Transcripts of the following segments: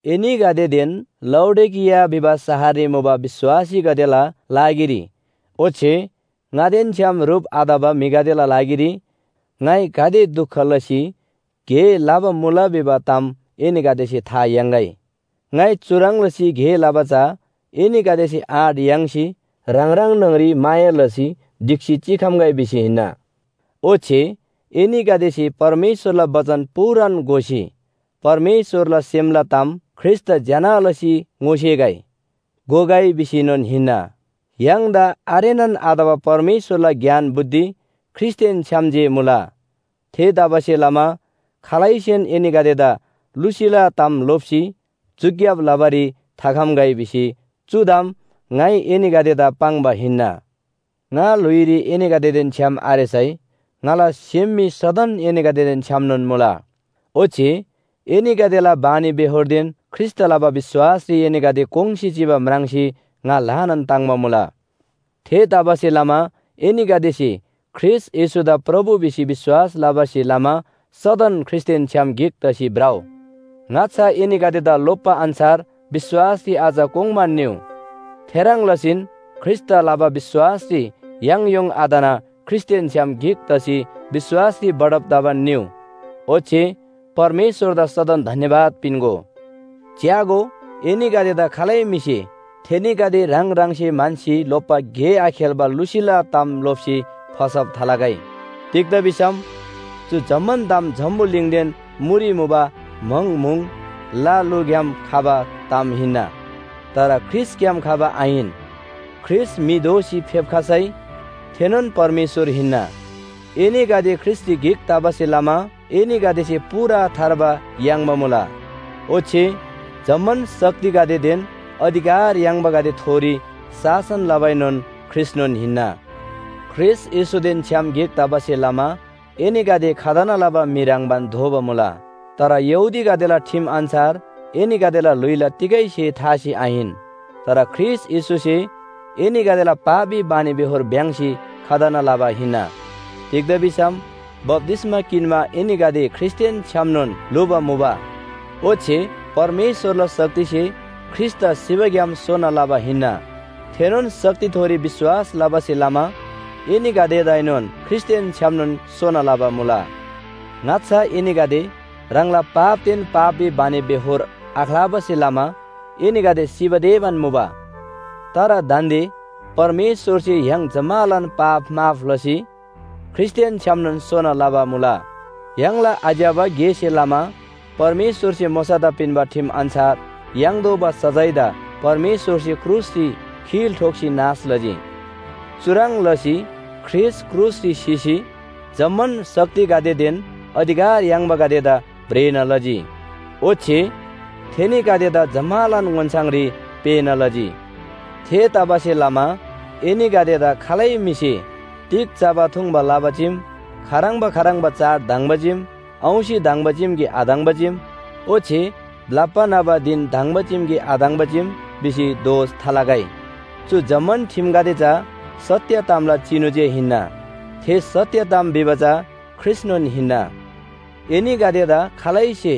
एनीगदेदेन लाउडिकिया भिबा शहररी मुबा विश्‍वासीगदेला लागिरी ओच्‍छे ङादेन छ्‌याम ह्रुप आतबा म्‍हिगदेला लागिरी ङाइ गाते दुख लसी गे लबा मुला भिबा ताम एनीगदेसे था याङ्‌गै। ङाइ चुह्रङ् लसी गे लबा चा एनीगदेसे आँट याङ्सी ह्राङ ह्राङ न्‍हङरी माया लसी ढिक्‍सी चिखम्‍गै भिसी हिन्‍ना। ओच्‍छे एनीगदेसे परमेश्‍वरला बचन पूरान घोसी परमेश्‍वरला सेमला ताम ख्रीष्‍टदा ज्‍यना लसी ङोसेगै, घोगै भिसीएनोन हिन्‍ना। य्‍हाङदा आरेनान आतबा परमेश्‍वरला ज्ञान बुद्धि ख्रीष्‍टदेन छ्‌याम जे मुला। थेतबासेलमा खालैसेन एनीगदेदा लुसीला ताम लोप्‍सी झुक्‍याब लबारी थाखम्‍गै भिसी चु ताम ङाइ एनीगदेदा पाङ्बा हिन्‍ना। ङा ल्‍हुइरी एनीगदेदेन छ्‌याम आरेसै ङाला सेम मी सदन एनीगदेदेन छ्‌यामनोन मुला। ओच्‍छे एनीगदेला बानीबेहोरदेन ख्रीष्‍टदा लबा विश्‍वासरी एनीगदे कोङ्‌सी चिबा म्राङ्सी ङा ल्‍हानान ताङ्‍बा मुला। थेतबासेलमा एनीगदेसे ख्रीष्‍ट येशूदा प्रभु भिसी विश्‍वास लबासे लमा सदन ख्रीष्‍टदेन छ्‌याम गिक तसी भ्रउ। ङाच्‍छा एनीगदेदा लोप्‍बा अन्‍छार विश्‍वासरी अझ कोङ्बान निउ। थेह्रङ् लसीन ख्रीष्‍टदा लबा विश्‍वासरी याङयोङ आतना ख्रीष्‍टदेन छ्‌याम गिक तसी विश्‍वासरी बढब तबान निउ। ओच्‍छे परमेश्‍वरदा सदन धन्‍यवाद पिन्‍गो। च्‍यागो, एनीगदेदा खालै म्‍हिसे थेनीगदे ह्राङ ह्राङसे म्‍हन्‍सी लोप्‍बा गे आखेल्‍बा लुसीला ताम लोप्‍सी फसब थालगै। तिग्‍दा भिसम चु जम्‍मान ताम जम्‍बुलिङदेन मुरी मुबा म्‍हङ म्‍हुङ, ल लुग्‍याम खबा ताम हिन्‍ना। तर ख्रीष्‍टग्‍याम खबा आहिन। ख्रीष्‍ट म्‍हि दोसी फेप्‍खसै थेनोन परमेश्‍वर हिन्‍ना। एनीगदे ख्रीष्‍टरी गिक तबासे लमा एनीगदेसे पूरा थार्बा याङ्बा मुला। ओच्‍छे जम्‍मान शक्तिगदेदेन अधिकार याङ्बागदेथोरी शासन लबाएनोन ख्रीष्‍टनोन हिन्‍ना। ख्रीष्‍ट येशूदेन छ्‌याम गिक तबासे लमा एनीगदे खतना लबा म्‍हि ह्रङ्‌बान दोबा मुला। तर यहूदीगदेला ठिम अन्‍छार एनीगदेला ल्‍हुइला तिगै स्‍हे थासी आहिन। तर ख्रीष्‍ट येशूसे एनीगदेला पापी बानीबेहोर भ्‍याङ्‍सी खतना लबा हिन्‍ना। तिग्‍दा भिसम बप्‍तिस्‍मा किन्‍मा एनीगदे ख्रीष्‍टदेन छ्‌यामनोन ल्‍हुबा मुबा। ओच्‍छे परमेश्‍वरला शक्तिसे ख्रीष्‍टदा सिबाग्‍याम सोना लबा हिन्‍ना, थेनोन शक्तिथोरी विश्‍वास लबासे लमा एनीगदेदाएनोन ख्रीष्‍टदेन छ्‌यामनोन सोना लबा मुला। ङाच्‍छा एनीगदे ह्राङला पापदेन पापी बानीबेहोर आख्‍लाबासे लमा एनीगदे सिबा तेबान मुबा। तर दान्‍दे परमेश्‍वरसे य्‍हाङ जम्‍मालान पाप माफ लसी ख्रीष्‍टदेन छ्‌यामनोन सोना लबा मुला। य्‍हाङला आज्‍यबा गेसे लमा परमेश्‍वरसे मोशादा पिन्‍बा ठिम अन्‍छार याङ्तोःबा सजायदा परमेश्‍वरसे क्रुसरी खिल ठोक्‍सी नाश लजी। चुह्रङ् लसी ख्रीष्‍ट क्रुसरी सिसी जम्‍मान शक्तिगदेदेन अधिकार याङ्बागदेदा भ्रेना लजी। ओच्‍छे थेनीगदेदा जम्‍मालान ओन्‍छाङरी पेःना लजी। थेतबासेलमा एनीगदेदा खालै म्‍हिसे तिग चबा थुङ्बा लबा चीम, खाह्रङ्बा खाह्रङ्बा चाड धङ्बा चीम, औंसी धङ्बा चीम कि धङ्बा चीम ओच्‍छे ब्‍लप्‍बा न्‍हबा धिन धङ्बा चीम कि धङ्बा चीम भिसी दोष थालगै। चु जम्‍मान ठिमगदे चा सत्‍य तामला चिनु जे हिन्‍ना। थे सत्‍य ताम भिबा चा ख्रीष्‍टनोन हिन्‍ना। एनीगदेदा खालैसे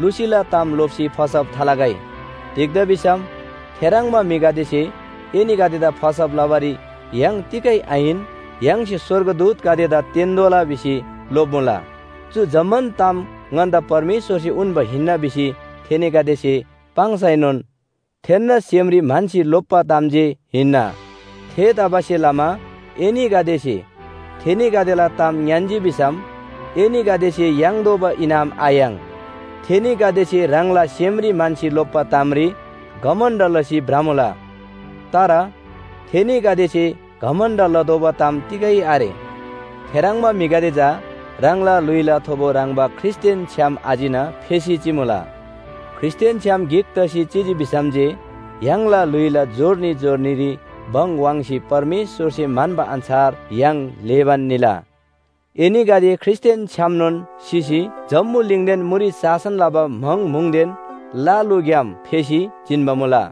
लुसीला ताम लोप्‍सी फसब थालगै। तिग्‍दा भिसम थेह्रङ्बा म्‍हिगदेसे एनीगदेदा फसब लबारी य्‍हाङ तिगै आहिन, य्‍हाङसे स्‍वर्गदूतगदेदा तेन्‍तोःला भिसी लोप्‍मुला। चु जम्‍मान ताम ङन्‍दा परमेश्‍वरसे उन्‍बा हिन्‍ना भिसी थेनीगदेसे पाङ्सैनोन थेन्‍ना सेमरी म्‍हन्‍सी लोप्‍बा ताम जे हिन्‍ना। थेतबासेलमा एनीगदेसे थेनीगदेला ताम ङ्‌यान्‍जी भिसम एनीगदेसे याङ्तोःबा इनाम आयाङ्। थेनीगदेसे ह्राङला सेमरी म्‍हन्‍सी लोप्‍बा तामरी घमण्‍ड लसी भ्रमुला। तर थेनीगदेसे घमण्‍ड लतोःबा ताम तिगै आरे। थेह्रङ्बा म्‍हिगदे चा ह्राङला ल्‍हुइला थोबो ह्रङ्‌बा ख्रीष्‍टदेन छ्‌याम आचिना, फेसी चिमुला। ख्रीष्‍टदेन छ्‌याम गिक तसी चिजी भिसम जे य्‍हाङला ल्‍हुइला जोर्नी जोर्नीरी भङ वाङ्सी परमेश्‍वरसे म्‍हन्‍बा अन्‍छार य्‍हाङ ल्‍हेबान निला। एनीगदे ख्रीष्‍टदेन छ्‌यामनोन सिसी जम्‍बुलिङदेन मुरी शासन लबा म्‍हङ म्‍हुङदेन ल लुग्‍याम फेसी जिन्‍बा मुला।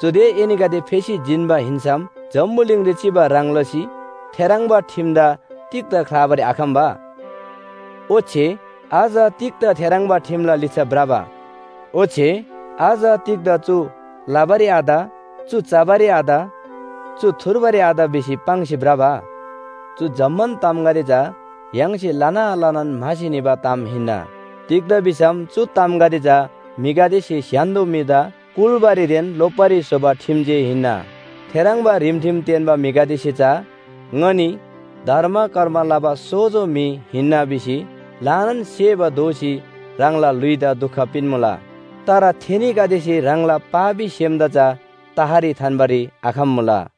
चुदे एनीगदे फेसी जिन्‍बा हिन्‍सम जम्‍बुलिङरी चिबा ह्रङ् लसी थेह्रङ्बा ठिमदा तिग्‍दा ख्‍लाबारी आखम्‍बा? ओच्‍छे अझ तिग्‍दा थेह्रङ्बा ठिमला लिच्‍छा भ्रबा? ओच्‍छे अझ तिग्‍दा चु लबारी आत, चु चबारी आत, चु थुर्बारी आत भिसी पाङ्सी भ्रबा? चु जम्‍मान तामगदे चा य्‍हाङसे लना लनान म्‍हासी निबा ताम हिन्‍ना। तिग्‍दा भिसम चु तामगदे चा म्‍हिगदेसे स्‍य्‍हान्‍दो म्‍हिदा कुल्‍बारीदेन लोप्‍बारी स्‍होबा ठिम जे हिन्‍ना। थेह्रङ्बा रिमठिम तेन्‍बा म्‍हिगदेसे चा “ङनी धर्म कर्म लबा सोजो म्‍हि हिन्‍ना” भिसी ल्‍हानान सेबा दोसी ह्राङला ल्‍हुइदा दुख पिन्‍मुला। तर थेनीगदेसे ह्राङला पापी सेमदा चा तहरी थान्‍बारी आखम्‍मुला।